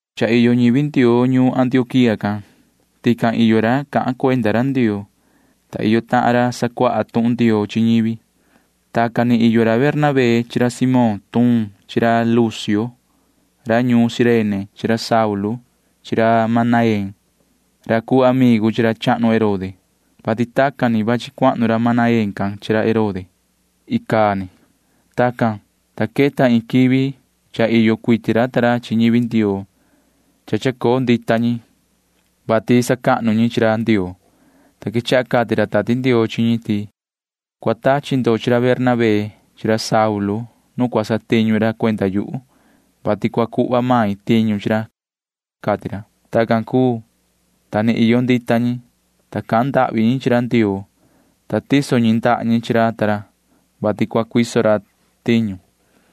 Cha iyo ñivi Ndioo ñuun Antioquía can. Tican iyo ra cahan cuenda ra Ndioo, ta iyo tahan ra sacuaha tuhun Ndioo chi ñivi. Tacan ni iyo ra Bernabé chi ra Simón tuun chi ra Lucio ra ñuun Cirene chi ra Saulu chi ra Manaén ra cuu amigu chi ra chahnu Herode, vati tacan ni vachi cuahnu ra Manaén can chi ra Herode icaa ni. Tacan, ta queta iin quivi cha iyo cuiti ra ta ra chi ñivi Ndioo. Cha chacoo ndita ñi, [vati sacahnu ñi chi ra Ndioo,] ta quechaha cati ra Tati Ndioo chi ñi ti: ―Cua tachi ndo chi ra Bernabé chi ra Saulu nu cua satiñu ra cuenda yuhu, vati cua cuhva main tiñu chi ra ―cati ra. Tacan cuu, ta ni iyo ndita ñi, ta cahan ndahvi ñi chi ra Ndioo, ta tiso ñi ndaha ñi chi ra ta ra, [vati cua cuiso ra tiñu].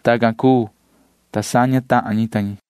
Tacan cuu, ta saña tahan ñi ta ñi.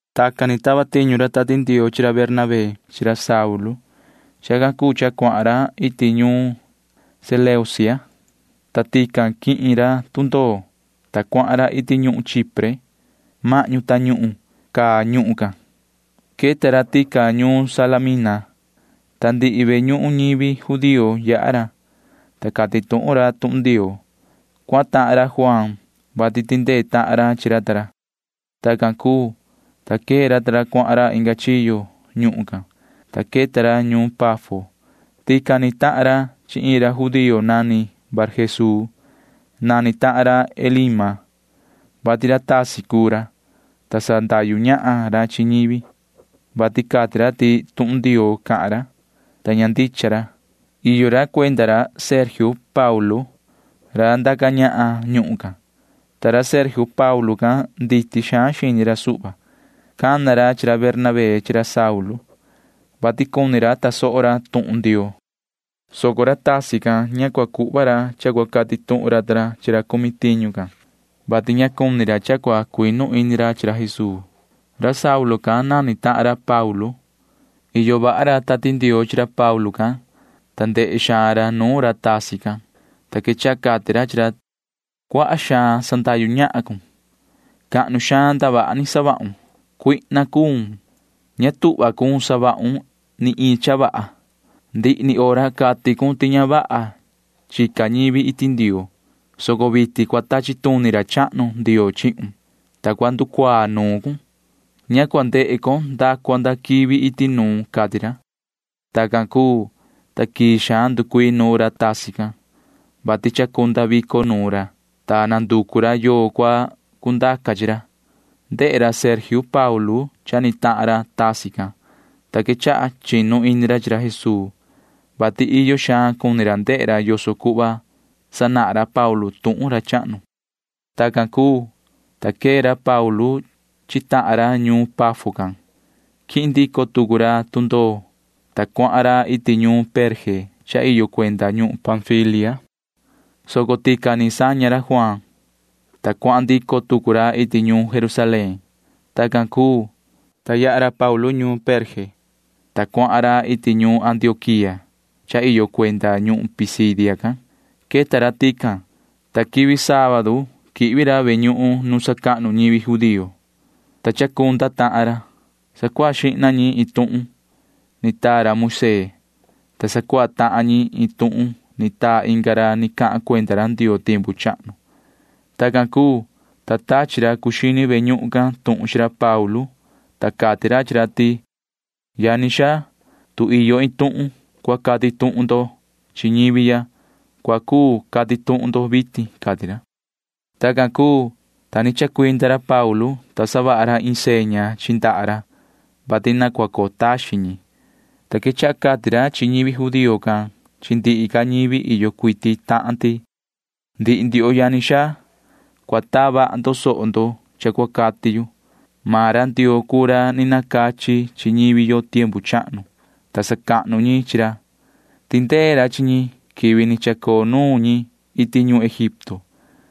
Tacan ni tava tiñu ra Tati Ndioo chi ra Bernabé chi ra Saulu. Chacan cuu cha cuahan ra iti ñuun Seleucia, ta tican quihin ra tundoo, ta cuahan ra iti ñuhun Chipre. Mahñu tañuhun caa ñuhun can. Queta ra tican ñuun Salamina, ta ndihi ve ñuhun ñivi judío yaha ra, ta cati tuhun ra tuhun Ndioo. Cuahan tahan ra Juaan, vati tindee tahan ra chi ra ta ra. Tacan cuu, ta quee ra ta ra cuahan ra inga chiyo ñuhun can, ta queta ra ñuun Pafo. Tican ni tahan ra chi iin ra judío nani Barjesuu. Nani tahan ra Elima, vati ra tasi cuu ra, ta sandahyu ñahan ra chi ñivi, vati cati ra ti tuhun Ndioo cahan ra, ta ña ndicha ra. Iyo ra cuenda ra Sergio Paulo ra ndaca ñahan ñuhun can, ta ra Sergio Paulo can nditi xaan xini ra suhva. Cana ra chi ra Bernabé chi ra Saulu, vati cuni tasoho ra tuhun Ndioo, soco ra tasi can ña cua cuhva ra cha cua cati tuhun ra ta ra chi ra cumi tiñu can, vati ña cuni ra cha cua cuinu ini ra chi ra Jesuu. Ra Saulu can nani tahan ra Paulu. Iyo vaha ra Tati Ndioo chi ra Paulu can, ta ndehe xaan ra nuun ra tasi can, ta quechaha cati ra chi ra: ―Cuaha xaan sandahyu ñahan cun. Cahnu xaan ndavaha ni savahun. Cuihna cuun. Ña tuhva cun savahun ni iin cha vaha. Ndihi ni hora cati cun ti ña vaha chica ñivi iti Ndioo, soco vitin cua tachi tuni ra chahnu Ndioo chihun, ta cua nducuaa nuun cun. Ña cua ndehe con nda cua nda quivi iti nuun ―cati ra. Tacan cuu, ta quii xaan nducuii nuun ra tasi can, vati chacunda vico nuun ra, ta nanducu ra yoo cua cundaca chi ra. Ndehe ra Sergio Paulo cha ni tahan ra tasi can, ta quechaha chinu ini ra chi ra Jesuu, vati iyo xaan cuni ra ndehe ra yoso cuhva sanahan ra Paulu tuhun ra chahnu. Tacan cuu, ta quee ra Paulu chi tahan ra ñuun Pafo can. Quihin ndico tucu ra ta ra tundoo, ta cuahan ra iti ñuun Perge cha iyo cuenda ñuhun Panfilia, soco tican ni saña ra Juaan, ta cuahan ndico tucu ra iti ñuun Jerusalén. Tacan cuu, ta yaha ra Paulu ta ra ñuun Perge, ta cuahan ra iti ñuun Antioquía cha iyo cuenda ñuhun Pisidia can. Queta ra tican, ta quivi sábadu quihvi ra ve ñuhun nu sacahnu ñivi judío, ta chacunda tahan ra. Sacuaha xihna ñi iin tuhun ni taa ra Moisee, ta sacuaha tahan ñi iin tuhun ni taa inga ra ni cahan cuenda ra Ndioo tiempu chahnu. Tacan cuu, ta tachi ra cuu xini ve ñuhun can tuhun chi ra Paulu ta ra, ta cati ra chi ra ti: ―Yani xaa, tu iyo iin tuhun cua cati tuhun ndo chi ñivi ya, cua cuu cati tuhun ndo vitin ―cati ra. Tacan cuu, ta ni chacuinda ra Paulu, ta savaha ra iin seña chi ndaha ra, vati na cua coo taxin ñi, ta quechaha cati ra chi ñivi judío can chi ndihi ca ñivi iyo cuiti tahan ti: ―Ndihi ndioho yani xaa, cua taa vaha ndo soho ndo cha cua cati yu. Maan ra Ndioo cuu ra ni nacachi chi ñivi yo tiempu chahnu, ta sacahnu ñi chi ra. Tindee ra chi ñi quivi ni chacoo nuun ñi iti ñuhun Egipto,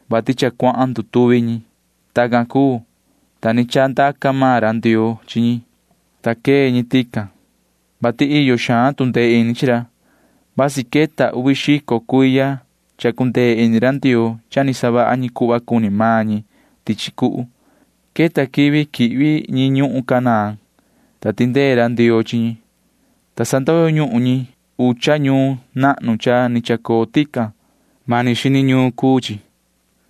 vati cha cuahan ndutuvi ñi. Tacan cuu, ta ni chandaca maan ra Ndioo chi ñi, ta quee ñi tican, vati iyo xaan tu ndee ini chi ra. Vasi queta uvi xico cuiya cha cundee ini ra Ndioo cha ni savaha ñi cuhva cuni maan ñi tichi cuhu. Queta quivi quihvi ñi ñuhun Canaán, ta tindee ra Ndioo chi ñi, ta sandoyo ñuhun ñi ucha ñuun nahnu cha ni chacoo tican. Mani xini ñuun cuu chi,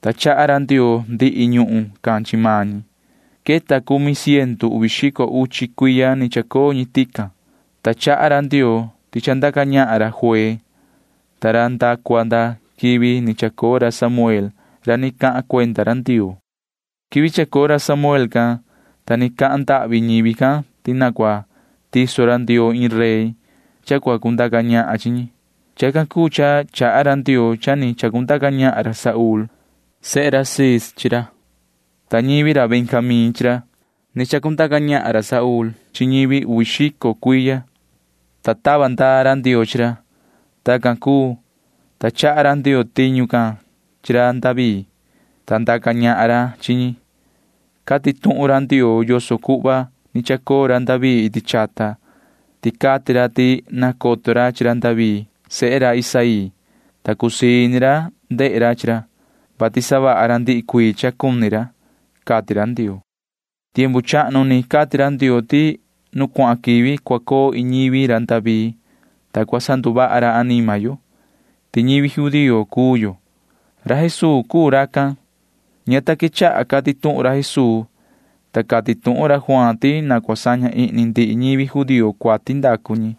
ta chaha ra Ndioo ndihi ñuhun can chi maan ñi. Queta cumi ciendu uvi xico uchi cuiya ni chacoo ñi tican, ta chaha ra Ndioo ti chandaca ñahan ra juee ta ra nda cua nda quivi ni chacoo ra Samuel ra ni cahan cuenda ra Ndioo. Quivi chacoo ra Samuel can, ta ni cahan ndahvi ñivi can ti na cua tiso ra Ndioo iin rey cha cua cundaca ñahan chi ñi. Chacan cuu cha chaha ra Ndioo cha ni chandaca ñahan ra Saúl sehe Cis chi ñi, ta ñivi ra Benjamín chi ra. Ni chandaca ñahan ra Saúl chi ñi uvi xico cuiya, ta tava ndaa ra Ndioo chi ra. Tacan cuu, ta chaha ra Ndioo tiñu can chi ra David, ta ndaca ñahan ra chi ñi. Cati tuhun ra Ndioo yoso cuhva ni chacoo ra David iti chata, ti cati ra ti nacoto ra chi ra David sehe ra Isaí, ta cusii ini ra ndehe ra chi ra, vati savaha ra ndihi cuii cha cuni ra, cati ra Ndioo. Tiempu chahnu ni cati ra Ndioo ti nu cuahan quivi cua coo iin ñivi ra David, ta cua sanduvaha ra anima yo, ti ñivi judío cuu yo. Ra Jesuu cuu racan. Ña ta quechaha cati tuhun ra Jesuu, ta cati tuhun ra Juaan ti na cua saña ihni ndihi ñivi judío cuati ndacu ñi,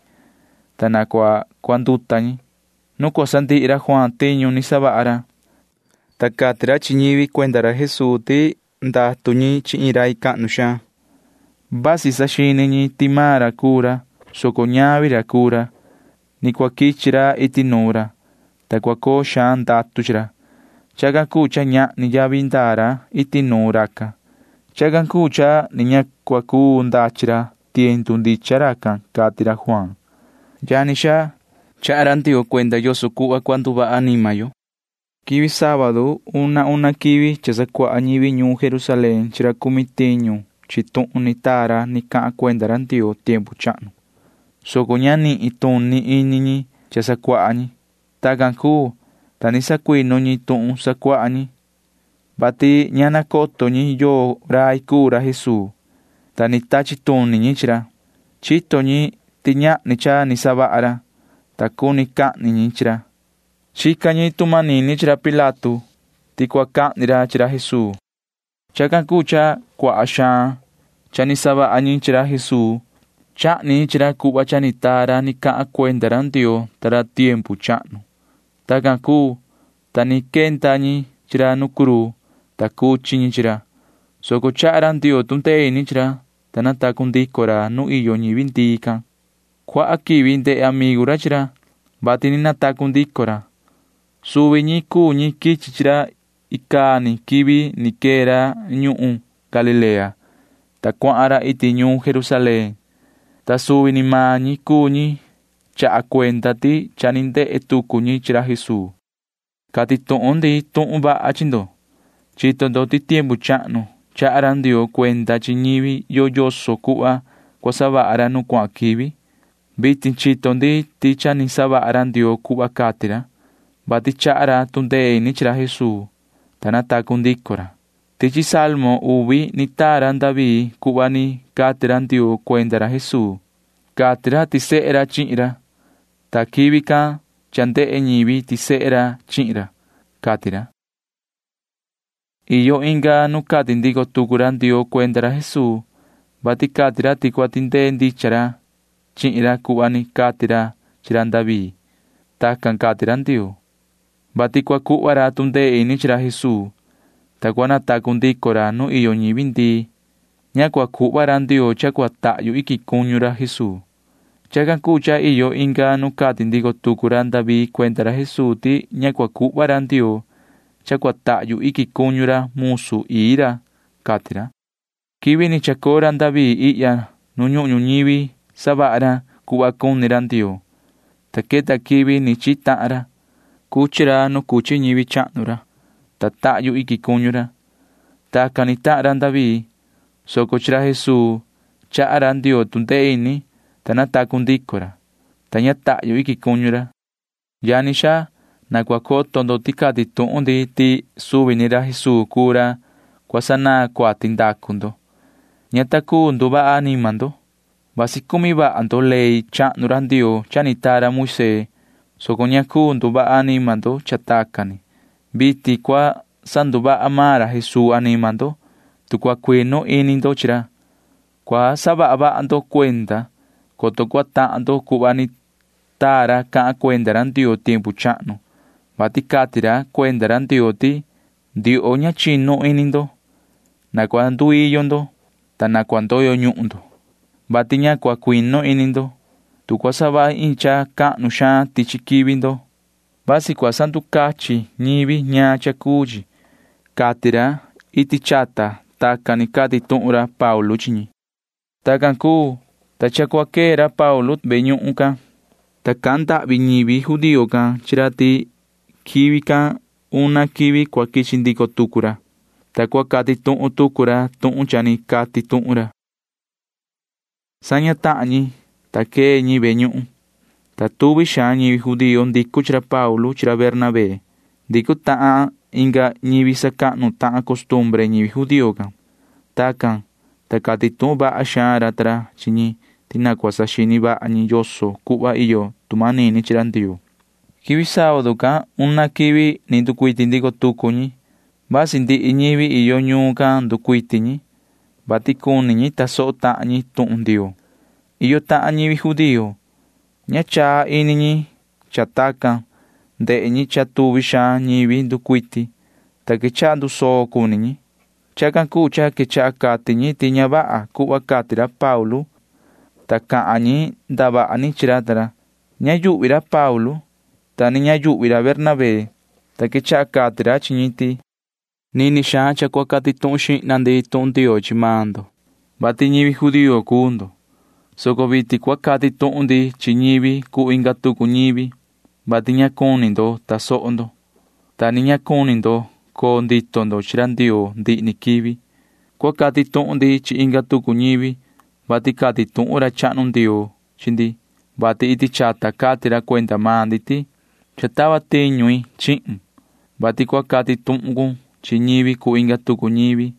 ta na cua cuanduta ñi. Nu cua sandihi ra Juaan tiñu ni savaha ra, ta cati ra chi ñivi cuenda ra Jesuu ti ndatu ñi chi iin rai cahnu xaan. Vasi saxini ñi ti maan ra cuu ra, soco ñavi ra cuu ra. Ni cua quichi ra iti nuun ra, ta cua coo xaan ndatu chi ra. Chacan cuu cha ñahni yavi ndaa ra iti nuun racan. Chacan cuu cha ni ña cua cuu ndachi ra tiendu ndichan racan, cati ra Juaan. ’Yani xaa, chaha ra Ndioo cuenda yoso cuhva cua nduvaha anima yo. Quivi sábadu una una quivi cha sacuaha ñivi ñuun Jerusalén chi ra cumi tiñu ñi tuhun ni taa ra ni cahan cuenda ra Ndioo tiempu chahnu, soco ña nituni ini ñi cha sacuaha ñi. Tacan cuu, ta ni sacuinu ñi tuhun sacuaha ñi, vati ña nacoto ñi yoo rai cuu ra Jesuu, ta ni tachi tuni ñi chi ra. Chito ñi ti ñahni cha ni savaha ra, ta cuni cahni ñi chi ra. Chica ñi tu manini chi ra Pilato ti cua cahni ra chi ra Jesuu. Chacan cuu cha cuaha xaan cha ni savaha ñi chi ra Jesuu. Chahni ñi chi ra cuhva cha ni taa ra ni cahan cuenda Ndioo ta ra tiempu chahnu. Tacan cuu, ta ni quenda ñi chi ra nu cruu, ta cuchi ñi chi ra, soco chaha ra Ndioo tu ndee ini chi ra, ta natacu ndico ra nuu iyo ñivi ndii can. Cuaha quivi ndehe amigu ra chi ra, vati ni natacu ndico ra. Suvi ñi cuu ñi quichi chi ra icaa ni quivi ni quee ra ñuhun Galilea, ta cuahan ra iti ñuun Jerusalén, ta suvi ni maan ñi cuu ñi chaha cuenda ti cha ni ndehe tucu ñi chi ra Jesuu. ’Cati tuhun ndi tuhun vaha chi ndo. Chito ndo ti tiempu chahnu chaha ra Ndioo cuenda chi ñivi yo yoso cuhva cua savaha ra nu cuahan quivi. Vitin chito ndi ti cha ni savaha ra Ndioo cuhva cati ra, vati chaha ra tu ndee ini chi ra Jesuu, ta natacu ndico ra. Tichi salmo uvi ni taa ra David cuhva ni cati ra Ndioo cuenda ra Jesuu. Cati ra ti sehe ra chihin ra, ta quivi can cha ndehe ñivi ti sehe ra chihin ra, cati ra. Iyo inga nu cati ndico tucu ra Ndioo cuenda ra Jesuu, vati cati ra ti cua tindee ndicha ra chihin ra cuhva ni cati ra chi ra David. Tacan cati ra Ndioo, vati cua cuhva ra tu ndee ini chi ra Jesuu, ta cua natacu ndico ra nu iyo ñivi ndii. Ña cua cuhva ra Ndioo cha cua tahyu iquin cuñu ra Jesuu. Chacan cuu cha iyo inga nu cati ndico tucu ra David cuenda ra Jesuu ti ña cua cuhva ra Ndioo cha cua tahyu iquin cuñu ra musu ii ra, cati ra. Quivi ni chacoo ra David ihya nu ñuhun ñuñivi savaha ra cuhva cuni ra Ndioo, ta queta quivi ni chihi tahan ra. Cuchi ra nu cuchi ñivi chahnu ra, ta tahyu iquin cuñu ra. Tacan ni tahan ra David, soco chi ra Jesuu chaha ra Ndioo tu ndee ini, ta natacu ndico ra, ta ña tahyu iquin cuñu ra. Yani xaa, na cua coto ndo ti cati tuhun ndi ti suvi ni ra Jesuu cuu ra cua sanaan cuati ndacu ndo. Ña ta cuu nduvaha anima ndo. Vasi cumi vaha ndo ley chahnu ra Ndioo cha ni taa ra Moisee, soco ña cuu nduvaha anima ndo cha tacan ni. Vitin cua sanduvaha maan ra Jesuu anima ndo, tu cua cuinu ini ndo chi ra. Cua saha vaha ndo cuenda, coto cua tahan ndo cuhva ni taa ra cahan cuenda ra Ndioo tiempu chahnu, vati cati ra cuenda ra Ndioo ti: Ndioho ña chinu ini ndo. Na cua nduiyo ndo, ta na cua ndoyo ñuhun ndo, vati ña cua cuinu ini ndo. Tu cua savahi iin cha cahnu xaan tichi quivi ndo, vasi cua sanducachin ñivi ñaan cha cuu chi, cati ra iti chaha. Tacan ni cati tuhun ra Paulu chi ñi. Tacan cuu, ta cha cua quee ra Paulu ta ra ve ñuhun can, ta cahan ndahvi ñivi judío can chi ra ti quivi can una quivi cua quichi ndico tucu ra, ta cua cati tuhun tucu ra tuhun cha ni cati tuhun ra. Saña tahan ñi, ta quee ñi ve ñuhun, ta tuvi xaan ñivi judío ndicu chi ra Paulu chi ra Bernabé. Ndicu tahan inga ñivi sacahnu tahan costumbre ñivi judío can. Tacan, ta cati tuhun vaha xaan ra ta ra chi ñi ti na cua saxini vaha ñi yoso cuhva iyo tu manini chi ra Ndioo. Quivi sábadu can una quivi ni nducuiti ndico tucu ñi. Vasi ndihi ñivi iyo ñuun can nducuiti ñi, vati cuni ñi tasoho tahan ñi tuhun Ndioo. Iyo tahan ñivi judío―ña chaa ini ñi cha tacan. Ndehe ñi cha tuvi xaan ñivi nducuiti, ta quechaha ndusoo cuni ñi. Chacan cuu cha quechaha cati ñi ti ña vaha cuhva cati ra Paulu ta ra, ta cahan ñi ndavaha ni chi ra ta ra. Ña yuhvi ra Paulu, ta ni ña yuhvi ra Bernabé, ta quechaha cati ra chi ñi ti: ―Nini xaan cha cati tuhun xihna ndi tuhun Ndioo chi maan ndo, vati ñivi judío cuu ndo, soco vitin cua cati tuhun ndi chi ñivi cuu inga tucu ñivi, vati ña cuni ndo tasoho ndo, ta ni ña cuni ndo coo ndito ndo chi ra Ndioo ndihi ni quivi. Cua cati tuhun ndi chi inga tucu ñivi, vati cati tuhun ra chahnu Ndioo chi ndi, vati iti chata cati ra cuenda maan ndi ti: Cha tava tiñu i chihun, vati cua cati tuhun cun chi ñivi cuu inga tucu ñivi.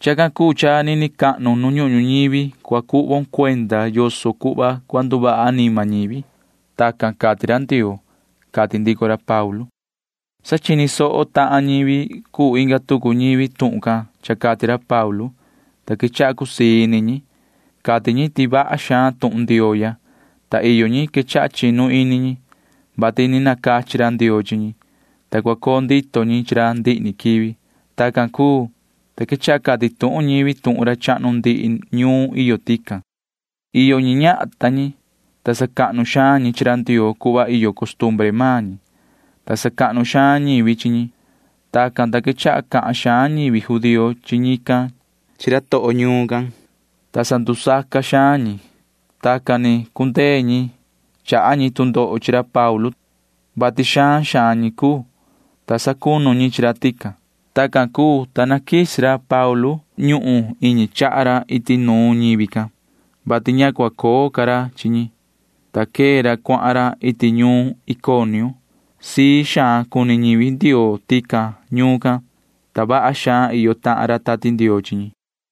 Chacan cuu cha nini cahnu nu ñuhun ñuñivi cua cuhvon cuenda yoso cuhva cua nduvaha anima ñivi. Tacan cati ra Ndioo ―cati ndico ra Paulu. Sa chini soho tahan ñivi cuu inga tucu ñivi tuhun can cha cati ra Paulu, ta quechaha cusii ini ñi. Cati ñi ti vaha xaan tuhun Ndioo ya, ta iyo ñi quechaha chinu ini ñi, vati ni nacachi ra Ndioo chi ñi, ta cua coo ndito ñi chi ra ndihi ni quivi. Tacan cuu, ta quechaha cati tuhun ñivi tuhun ra chahnu ndihi ñuun iyo tican. Iyo ñi ñahan ta ñi, ta sacahnu xaan ñi chi ra Ndioo cuhva iyo costumbre maan ñi, ta sacahnu xaan ñivi chi ñi. Tacan, ta quechaha cahan xaan ñivi judío chi ñican chi ra toho ñuun can, ta sandusaca xaan ñi. Tacan ni cundee ñi chaha ñi tu ndoho chi ra Paulu ta ra, vati xaan xaan ñi cuu, ta sacunu ñi chi ra tican. Tacan cuu, ta naquisi ra Paulu ta ra ñuhun iñi chaha ra iti nuun ñivi can, vati ña cua coo ca ra chi ñi, ta quee ra cuahan ra iti ñuun Iconio. Sii xaan cuni ñivi Ndioo tican ñuun can, ta vaha xaan iyo tahan ra Tati Ndioo chi ñi.